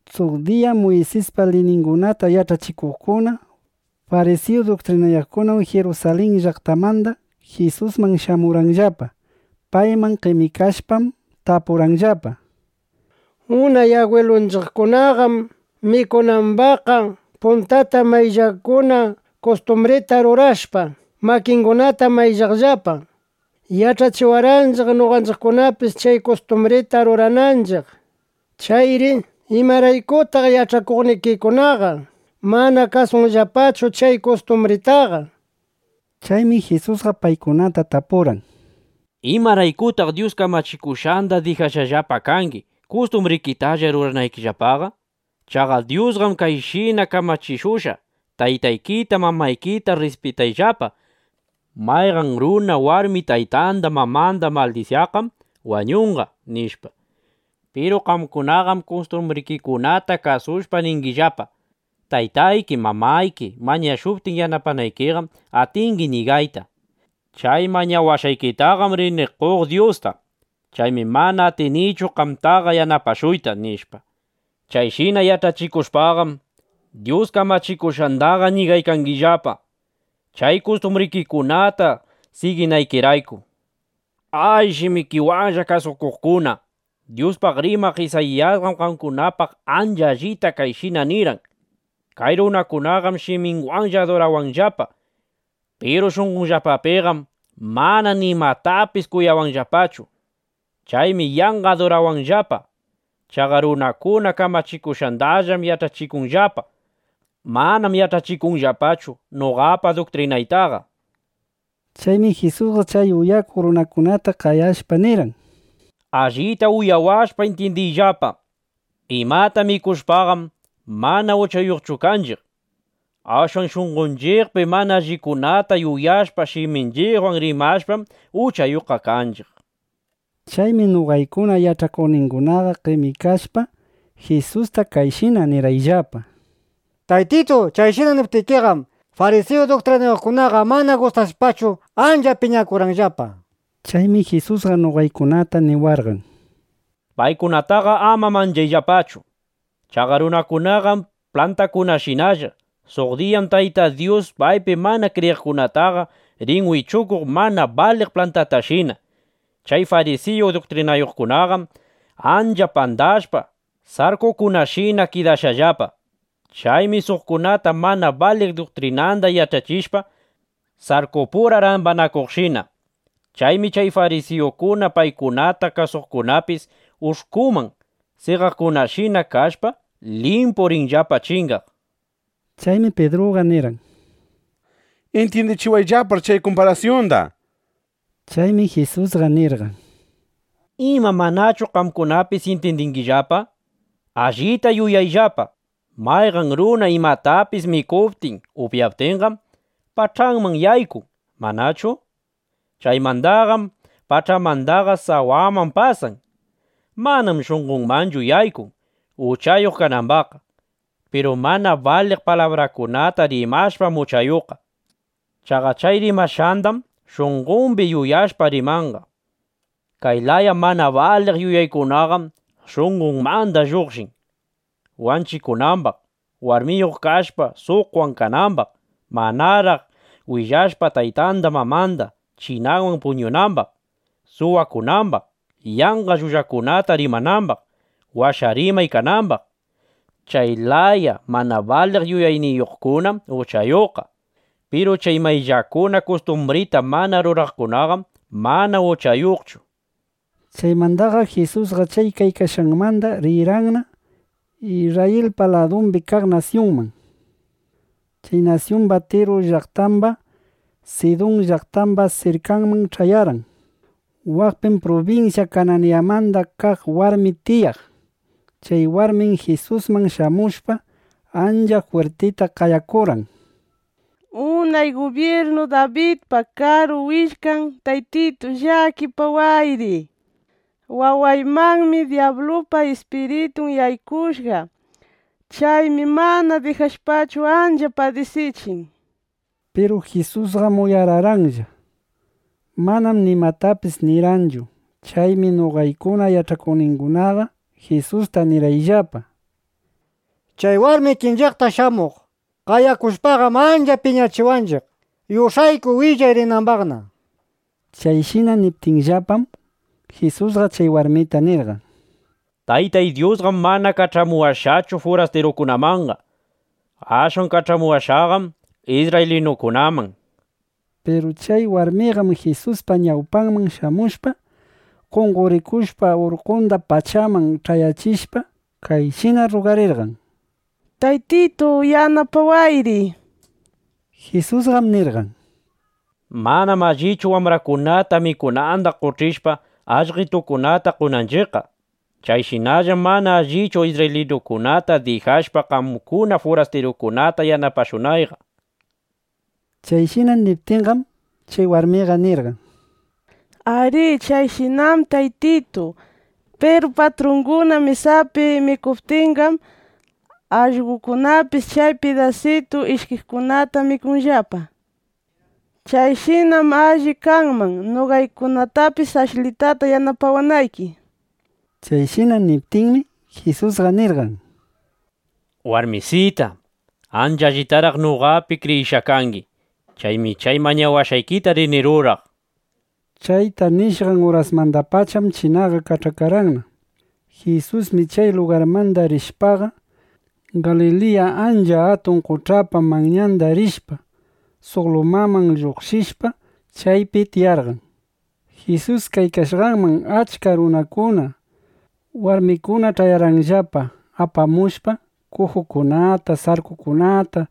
Suq diyam Muysispa liyningunata yach'achikuqkuna, farisiyu duktrinayuqkuna Jirusalin llaqtamanda Jisusman shamurqanllapa. Payman qemikashpam, tapurqanllapa: —Unay agwilunchiqkunaqam mikunambaqqa puntata mayllakuna kustumbrita rurashpa, makingunata mayllaqllapa. Yach'achiwarqanchiq, noqanchiqkunapis chay kustumbrita rurananchiq. Chayri ¿imaraykutaq yach'akuqnikikunaqa mana kasunllapachu chay kustumbritaqa? nishpa. Chaymi Jisusqa paykunata tapurqan: —¿Imaraykutaq Dyus kamachikushqanda dijashqallapa kangi, kustumbrikitalla ruranaykillapaqa? Chaqa Dyusqam kayshina kamachikushqa: “Taytaykita, mamaykita rrispitayllapa. Mayqan runa warmi taytanda mamanda maldisyaqqam wañunqa”, nishpa. Piru qamkunaqam kustumbrikikunata kasushpa, ningillapa: “Taytayki, mamayki mañashuptin yanapanaykiqam, atingi ñigayta: ‘Chay mañawashqaykitaqam rini qoq Dyusta. Chaymi mana atinichu qamtaqa yanapashuyta’”, nishpa. Chayshina yach'achikushpaqam, Dyus kamachikushqandaqa ñigaykangillapa, chay kustumbrikikunata siginaykirayku. ¡A, shimikiwanlla kasukuqkuna! Dyuspaq rimaq Isayiyasqam qamkunapaq ancha allita kayshina nirqan: Kay runakunaqam shiminwanlla adurawanllapa. Piru shunqonllapapiqam mana nimatapis kuyawanllapachu. Chaymi yanqa adurawanllapa. Chaqa runakuna kamachikushqandallam yach'achikunllapa. Manam yach'achikunllapachu noqapa duktrinaytaqa, nishpa. Chaymi Jisusqa chay uyakuq runakunata qayashpa nirqan: —Allita uyawashpa, intyindiyllapa: Imata mikushpaqam, mana uchayuqchu kanchiq. Ashwan shunqonchiqpi mana allikunata yuyashpa, shiminchiqwan rimashpam, uchayuqqa kanchiq, nishpa. Chaymi noqaykuna yach'akuqningunaqa qemikashpa, Jisusta kayshina nirqayllapa: —Taytitu, chayshina niptikiqam, farisiyu duktrinayuqkunaqa mana gustashpachu ancha piñakurqanllapa. Chaymi Jisusqa noqaykunata niwarqan: —Paykunataqa ama manchayllapachu. Chaqa runakunaqam plantakunashinalla. Suq diyam Tayta Dyus paypi mana kriyiqkunataqa rin wichukuq mana baliq plantatashina. Chay farisiyu duktrinayuqkunaqam ancha pandashpa, sarkukunashina kidashqallapa. Chaymi suqkunata mana baliq duktrinanda yach'achishpa, sarkupura rambanakuqshina. Chaymi chay farisiyukuna, paykunata kasuqkunapis ush'kuman seqaqkunashina kashpa, limpu rinllapa chingaq, nishpa. Chaymi Pidruqa nirqan: —Intyindichiwayllapár chay kumparasyunda, nishpa. Chaymi Jisusqa nirqan: —¿Ima manachu qamkunapis intyindingillapa? Allita yuyayllapa. Mayqan runa imatapis mikuptin upyaptinqam, pach'anman yaykun, ¿manachu? Chaymandaqam pach'anmandaqa sawaman pasan. (Manam shunqonmanchu yaykun, uchayuq kanambaqqa.) Piru mana baliq palabrakunata rimashpam uchayuqqa. Chaqa chay rimashqandaqam shunqombi yuyashpa, rimanqa. Kay laya mana baliq yuyaykunaqam shunqonmanda lluqshin: wanchikunambaq; warmiyuq kashpa, suqwan kanambaq; manaraq willashpa taytanda mamanda, chinawan puñunambaq; suwakunambaq; yanqa llullakunata rimanambaq; washa rimay kanambaq. Chay laya mana baliq yuyayniyuqkunam uchayuqqa. Piru chay mayllakuna kustumbrita mana ruraqkunaqam mana uchayuqchu, nishpa. Chaymandaqam Jisusqa chay kaykashqanmanda rirqanna (Isrrayilpa ladumbi kaq nasyunman.) Chay nasyumba Tiru llaqtamba, Sidun llaqtamba sirkanman ch'ayarqan. Waqpim prubinsya Kanayanmanda kaq warmi tiyaq. Chay warmim Jisusman shamushpa ancha jwirtita qayakurqan: —¡Unay gubyirnu Dabidpa Karu Willkan Taytitu, llakipawayri! ¡Wawaymanmi dyablupa ispiritun yaykushqa! ¡Chaymi mana dijashpachu, ancha padisichin! nishpa. Piru Jisusqam uyararqanlla. Manam nimatapis nirqanchu. Chaymi noqaykuna yach'akuqningunaqa Jisusta nirqayllapa: —Chay warmi ikinchiqta shamuq qayakushpaqam ancha piñachiwanchiq. Yush'ayku, willay rinambaqna. Chayshina niptiyllapam, Jisusqa chay warmita nirqan: —Taytay Dyusqam mana kach'amuwashqachu furastirukunamanqa. Ashwan kach'amuwashqaqam isrraylinukunaman, nishpa. Piru chay warmiqam Jisuspa ñawpanman shamushpa, qonqorikushpa urkunda pachaman ch'ayachishpa, kayshina rrugarirqan: —¡Taytitu, yanapawayri! nishpa. Jisusqam nirqan: —Manam allichu wambrakunata mikunanda qoch'ishpa, allqetukunata qonanchiqqa. (Chayshinallam mana allichu, isrraylinukunata dijashpa, qamkuna furastirukunata yanapashunayqa), nishpa. Chayshina niptinqam, chay warmiqa nirqan: —Arí. Chayshinam, Taytitu. Piru patrunguna mesapi mikuptinqam, allqokunapis chay pidasitun ishkiqkunata mikunllapa. (Chayshinam alli kanman, noqaykunatapis ashlitata yanapawanayki), nishpa. Chayshina niptinmi, Jisusqa nirqan: —¡Warmisita! ¡Ancha allitaraq noqapi kriyishqa kangi! Chaymi chay mañawashqaykita rini ruraq, nishpa. Chayta nishqan urasmandapacham chinanqa kach'akarqanna. Jisusmi chay lugarmanda rishpaqa, Galiliya ancha atun qoch'apa manyanda rishpa, suq lumaman lluqshishpa, chaypi tiyarqan. Jisus kaykashqanman achka runakuna, warmikuna ch'ayarqanllapa apamushpa kujukunata, sarkukunata,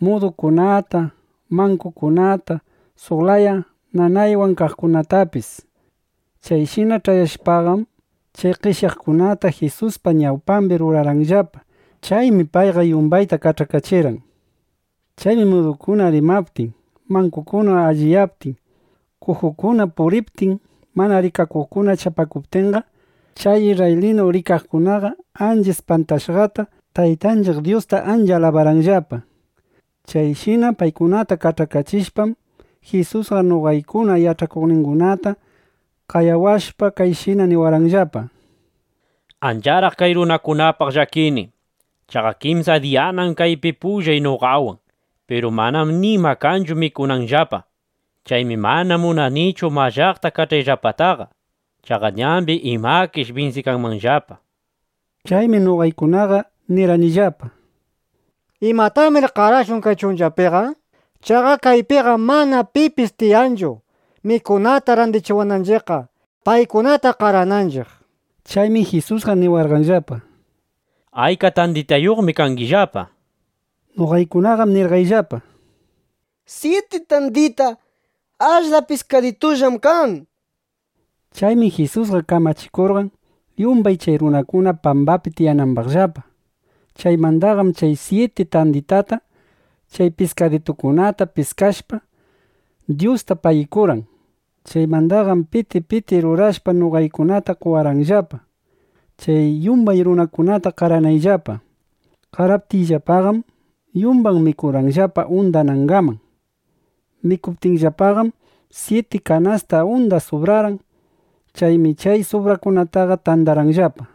mudukunata, mankukunata, suq laya nanaywan kaqkunatapis. Chayshina ch'ayashpaqam, chay qeshyaqkunata Jisuspa ñawpambi rurarqanllapa. Chaymi payqa yumbayta kach'akachirqan. Chaymi mudukuna rimaptin, mankukuna allinyaptin, kujukuna puriptin, mana rikakuqkuna chapakuptinqa, chay isrraylinu rikaqkunaqa ancha ispantashqata Taytanchiq Dyusta ancha alabarqanllapa. Chayshina paykunata kach'akachishpam, Jisusqa noqaykuna yach'akuqningunata qayawashpa, kayshina niwarqanllapa: —Ancharaq kay runakunapaq llakini. Chaqa kimsa diyanam kaypi pullay noqawan; piru manam nima kanchu mikunanllapaqa. Chaymi mana munanichu mallaqta kach'ayllapataqa. Chaqa ñambi imakish binsikanmanllapa, nishpa. Chaymi noqaykunaqa nirqanillapa: —¿Imatamir qarashun kay chunchapiqa? Chaqa kaypiqam mana pipis tiyanchu, mikunata randichiwananchiqqa, paykunata qarananchiq, nishpa. Chaymi Jisusqa niwarqanllapa: —¿Ayka tanditayuqmi kangillapa? nishpa. Noqaykunaqam nirqayllapa: —Syiti tandita, ashla piskaditullam kan, nishpa. Chaymi Jisusqa kamachikurqan, yumbay chay runakuna pambapi tiyanambaqllapa. Chaymandaqam chay syiti tanditata, chay piskaditukunata piskashpa, Dyusta pagikurqan. Chaymandaqam piti piti rurashpa, noqaykunata qowarqanllapa, chay yumbay runakunata qaranaypaqllapa. Qaraptiyllapaqam, yumbay mikurqanllapa undanangaman. Mikuptinllapaqam, syiti kanasta unda subrarqan. Chaymi chay subraqkunata tandarqayllapa.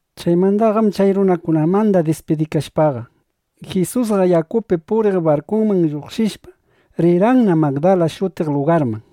Chaymandaqam chay runakunamanda dispidikashpaqa, Jisusqa yakupi puriq barkuman lluqshishpa, rirqanna Magdala shutiq lugarman.